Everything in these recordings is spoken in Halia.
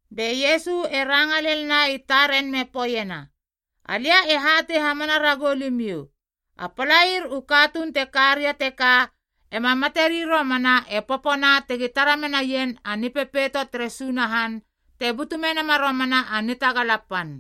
Be Iesu e ranga lelna i taren me poeiena, “Alia e hatei hamana ragou limiou, a palair u katuun te ka ria teka ema materi romana e popona tegi tara menaien a Nipepeito tere Sunahan te butu menama romana a nitagala pan.”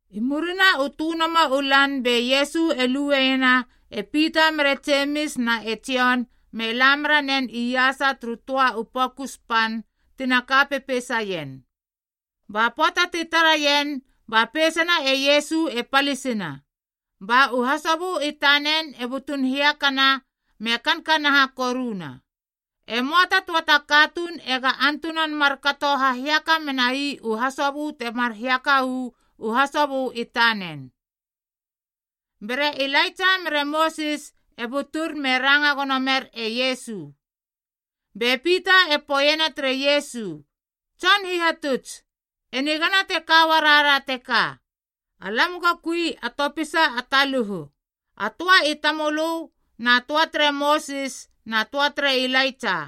I murina u tönomo u lan be Iesu e lueiena e Pita mere Jemis na e Jon me la meranen iasa turu töa u pokus pan tina ka pepeisaien. Ba pöata ti taraien ba peisana e Iesu e palisina, ba u hasobö i tanen e butun hiakana me kankanaha koruna. E möa ta töa ta katuun ega antunan markato hahiaka menai u hasobö temar hiaka uu hasobö i tanen. Be re Ilaitsa mere Mosis e butur me ranga gono mer e Iesu. Be Pita e poeiena tere Iesu, “Tson Hihatuts, e nigana te ka uarara teka. Alam go kui a topisa a taluhu, a töa i tamölö na töa tere Mosis na töa tere Ilaitsa.”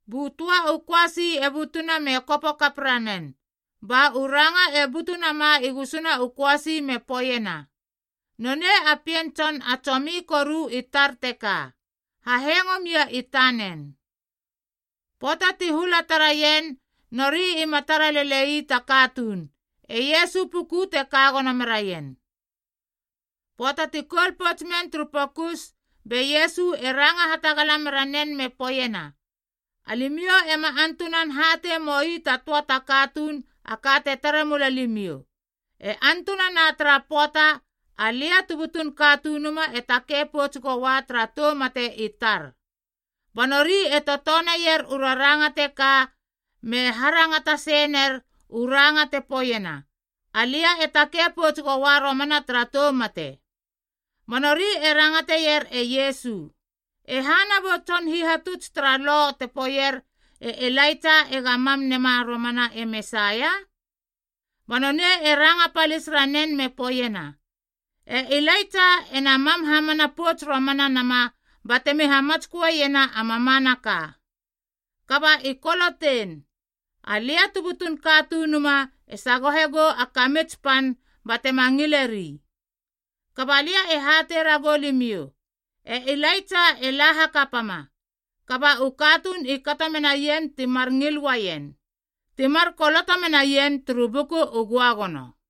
Bu töa u köasi e butuna me kopo kap ranen, ba u ranga e butu nama i gusuna u köasi me poeiena, “Nonei a Pien Tson a tsomi koru i tar teka. Hahengo mia i tanen.” Pöata ti hula tara ien nori ima tara lele ii ta katuun, e Iesu puku te ka gono meraien. Pöata ti koul pouts men turu pokus, be Iesu e ranga hatagala mera nen me poeiena, “Alimiou ema antunan hatei moi ta töa ta katuun a ka te tare mula limiou, e antunana tara pöata, Alia tu butun Katunuma e takei pouts goua tara tou mate i tar.” Ba nori e totoneier u raranga teka me harangata sei ner u ranga te poeiena, “Alia e takei pouts goua romana tara tou mate.” Ba nori e rangateier e Iesu, “E hana bu tson hihatuts tara Lo te poeier e Ilaitsa ega mam nema romana e Mesaia?” Ba nonei e ranga palis ranen me poeiena, “E Ilaitsa ena mam hamana pouts romana nama batemi hamatsköeiena a mamanaka. Kaba i kolotein, Alia tu butun Katunuma e sagohe gou a kamits pan batema ngileri. Kaba lia e hatei ragou limiou, e Ilaitsa e la hakapama, kaba u katuun i kato menaien timar ngil uaien, timar koloto menaien turu Buku u Göagono.”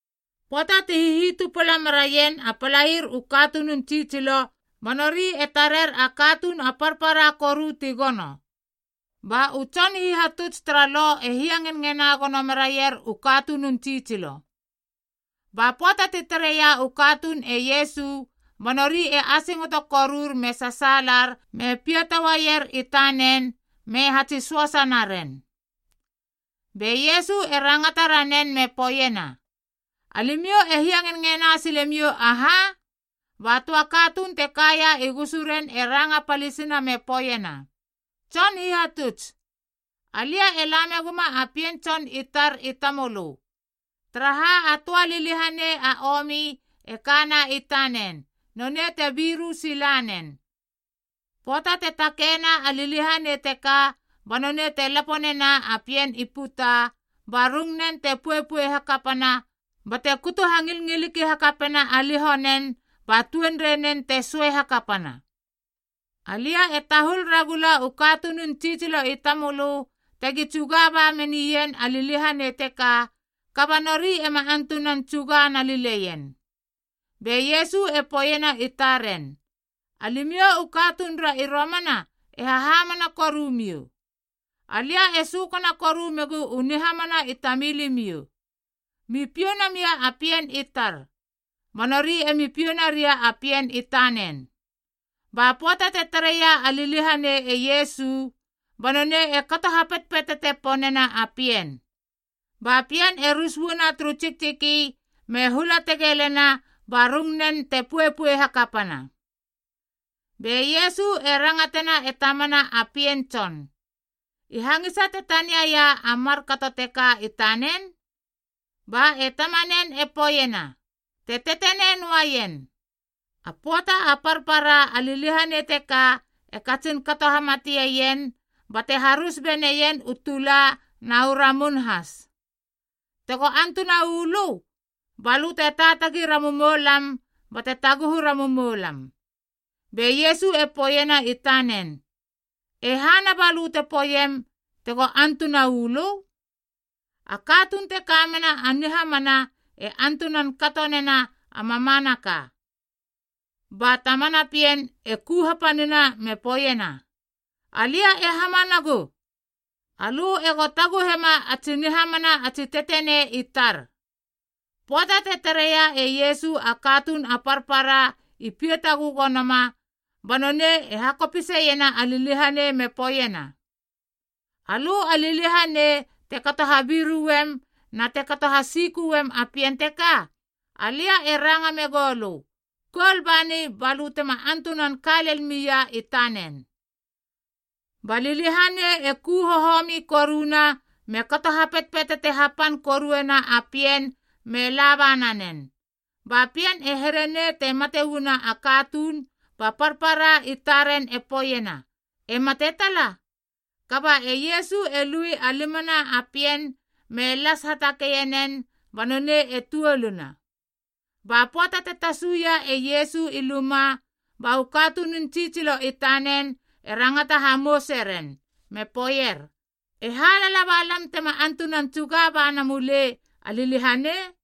Pöata ti hihitupala meraien a palair u katunun tsitsilo, ba nori e tarer a katuun a parpara koru ti gono. Ba u tson hihatuts tara Lo e hiangenngena gono meraier u katunun tsitsilo. Ba pöata ti tareia u katuun e Iesu ba nori e asingoto korur me sasaalar me piata uaier i tanen me hatsi söasa naren. Be Iesu e rangata ranen me poeiena, “Alimiou e hiangenngena silemiou aha?” Ba töa katuun te kaia i gusuren e ranga palisina me poeiena, “Tson Hihatuts, alia e la meguma a pien tson i tar i tamölö, taraha a töa liliahanei a omi e kana i tanen, nonei te biru sila nen. Pöata te takeina a liliahanei teka ba nonei te lapo nena a pien i puta, ba rungunen te poepoe hakapana bate kutu hangilngiliki hakapena a liho nen ba tuenrei nen te söei hakapana. Alia e tahul ragula u katunun tsitsilo i tamölö tegi tsuga ba menien a liliahanei teka, kaba nori ema antunan tsuga nalileien.” Be Iesu e poeiena i taren, “Alimiou u katunura i romana e hahamana korumiou. Alia e sökana koru megu u nihahamana i tamilimiou. Mi piou namia a pien i tar.” Ba nori emi piou naria a pien i tanen. Ba pöata te tareia a liliahanei e Iesu, ba nonei e kato hapetpetete ponena a pien, ba pien e rus uana turu tsiktsiki me hula tegelena ba rungnen te poepoe hakapana. Be Iesu e rangatena e tamana a pien tson, “I hangisa te taniaia a markato teka i tanen?” Ba e tamanen e poeiena, “Te tetenei noaien. A pöata a parpara a liliahanei teka e katsin kato hamatieien bate harus beneien u tula na u ramun has. Tego antuna uu lö, ba lö te taatagi ramumoulam bate taguhu ramumoulam.” Be Iesu e poeiena i tanen, “E hana balö te poeiem, ‘Tego antuna uu lö?’ A katuun te ka mena a nihamana e antunan kato nena a mamanaka.” Ba tamana pien e ku hapanina me poeiena, “Alia e hamanagu. Alö ego taguhema a tsi nihamana a tsi tetenei i tar.” Pöata te tareia e Iesu a katuun a parpara i piata gögonoma, ba nonei e hakopiseiena a liliahanei me poeiena, “Alö a liliahanei te kato habiruem na te hasiköem a pien teka, alia e ranga megou lö, koul bani balö tema antunan ka lel mia i tanen.” Ba liliahanei e ku hohomi koruna me kato hapetpetete hapan koruena a pien me laba nanen, ba pien e here nei te mate uana a katuun ba parpara i taren e poeiena, “E mate tala.” Kaba e Iesu e lui a limana a pien me las hatakeie nen ba nonei e tuoluna. Ba pöata te tasuia e Iesu i luma, ba u katunun tsitsilo i tanen e rangata hamouse ren me poeier, “E ha lala ba lam tema antunan tsuga ba na mulei a liliahanei?”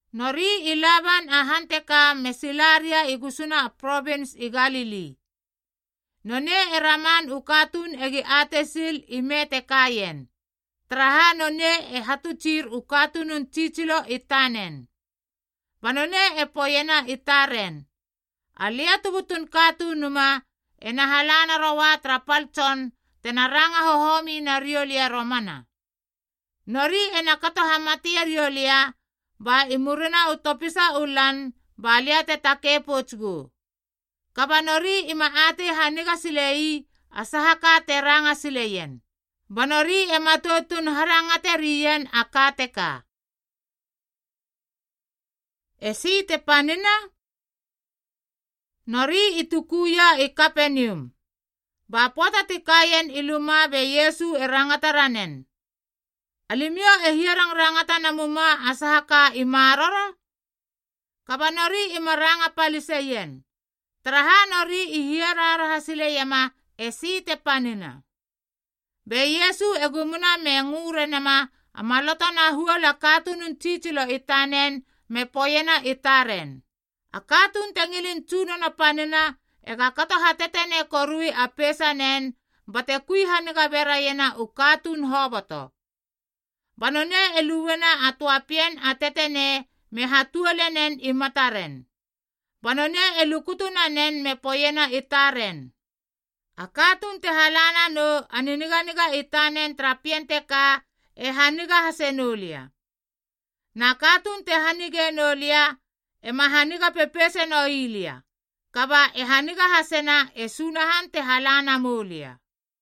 Nori i laban a han teka me sila ria i gusuna a provins i Galili. Nonei e raman u katuun egi atei sil ime te kaien, taraha nonei e hatutsir u katunun tsitsilo i tanen. Ba nonei e poeiena i taren, “Alia tu butun Katunuma ena hala naroua tara pal tson tena ranga hohomi nariou lia romana. Nori ena kato hamate riou lia, ba i murina u topisa u lan ba lia te takei pouts gou.” Kaba nori ima atei haniga silei a saha ka te ranga sileien, ba nori e matoutun harangate rien a ka teka. Esi te panina? Nori i tukuia i Kapenium. Ba pöata ti kaien i luma be Iesu e rangata ranen, “Alimiou e hiarangrangata namuma a saha ka i maroro?” Kaba nori ima ranga paliseien, taraha nori i hiaraharaha sileiema esi te panina. Be Iesu e gumuna me ngö renama a maloto na huol a katunun tsitsilo i tanen me poeiena i taren, “A katuun te ngilin tsunono panina ega kato hatetenei korui a peisanen bate kui haniga beraiena u katuun hoboto.” Ba nonei e luena a töa pien a tetenei me hatuole nen i mataren. Ba nonei e lukutu nanen me poeiena i taren, “A katuun te hala nanou a niniganiga i tanen tara pien teka e haniga hase noulia. Na katuun te hanige noulia ema haniga pepeise noi lia, kaba e haniga hasena e Sunahan te hala na moulia.”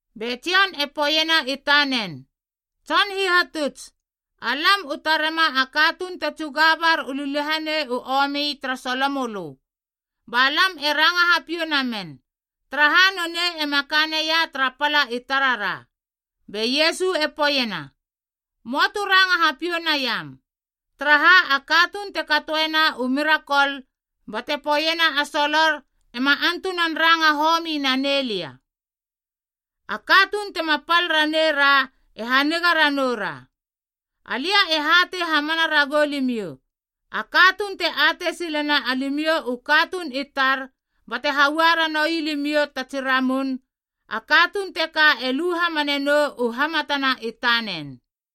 Be Jon e poeiena i tanen, “Tson Hihatuts, alam u tarema a katuun te tsuga bar u liliahanei u omi tara solo mölö. Ba lam e ranga hapiou namen, taraha nonei ema ka neia tara pala i tarara.” Be Iesu e poeiena, “Möa tu ranga hapiou naiam, taraha a katuun te katoena u mirakol bate poeiena a solor ema antunan ranga homi nanei lia. A katuun tema pal raneira e haniga ranoura. Alia e hatei hamana ragou limiou, a katuun te atei silena alimiou u katuun i tar bate haua ranoui limiou ta tsi ramun, a katuun teka e lu hamane nou u hamatana i tanen.”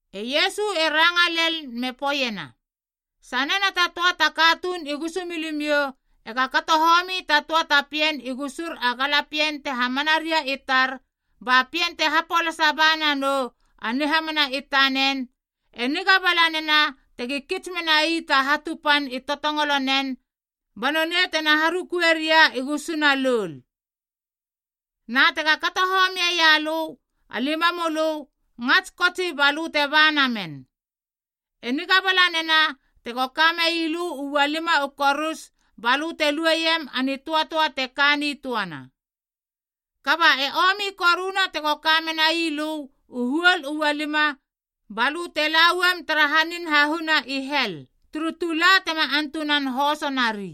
E Iesu e ranga lel me poeiena, “Sanena ta töa ta katuun i gusumilimiou ega kato homi ta töa ta pien i gusur a galapien te hamana ria i tar ba pien te hapolasa ba nanou a nihamana i tanen, e niga bala nena tegi kits menai ta hatu pan i totongolo na a katuun teka ba nonei tena harukue ria i gusuna loul. Na tega kato homieia lö a limamölö, ngats kotsi balö te ba namen. E niga bala nena tego kamei lö u ualima u korus balö te lueiem a nitöatöa te ka nitöana. Kaba e omi koruna tego ka menai lö u huol u ualima balö te lauam tara hanin hahuna i hel, turu tula tema antunan hoso nari.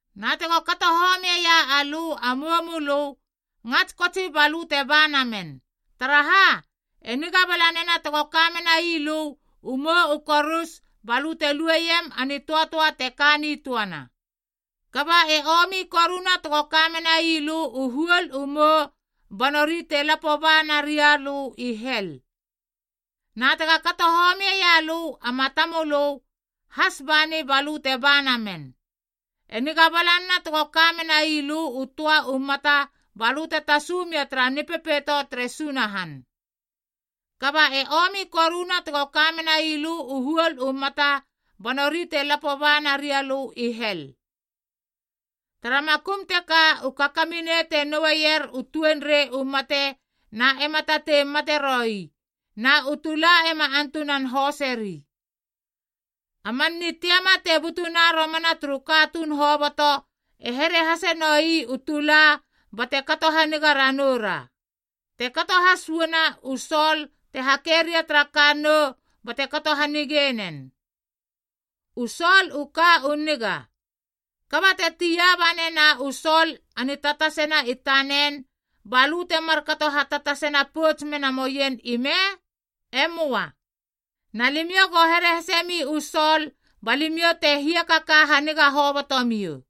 Na tego kato homieia alö a moumölö, ngats kotsi balö te ba namen. Taraha, e niga bala nena tego ka menai lö u mou u korus balö te lueiem a nitöatöa te ka nitöana. Kaba e omi koruna tego ka menai lö u huol u mou ba nori te lapo ba naria lö i hel. Na tega kato homieia lö a matamölö, has bani balö te ba namen. E niga bala nena tego ka menai lö u töa u mata balö te tasu mia tara Nipepeito tere Sunahan. Kaba e omi koruna tego ka menai lö u huol u mata ba nori te lapo ba naria lö i hel. Tara makum teka u kakaminei te noueier u tuenreina u mate na ema tatei mate roi, na u tula ema antunan hoseri. “A man nitiama te butuna romana turu katuun hoboto e here hase nou ii u tula bate kato haniga ranoura, te kato has uana u sol te hake ria tara kannou bate kato hanige nen. U sol u ka u niga. Kaba te taia ba nena u sol a nitatasena i tanen, ba lö temar kato hatatasena pouts mena moien ime? E möa. Na limiou go here hasemi u sol ba limiou te hiakaka haniga hobotomiou.”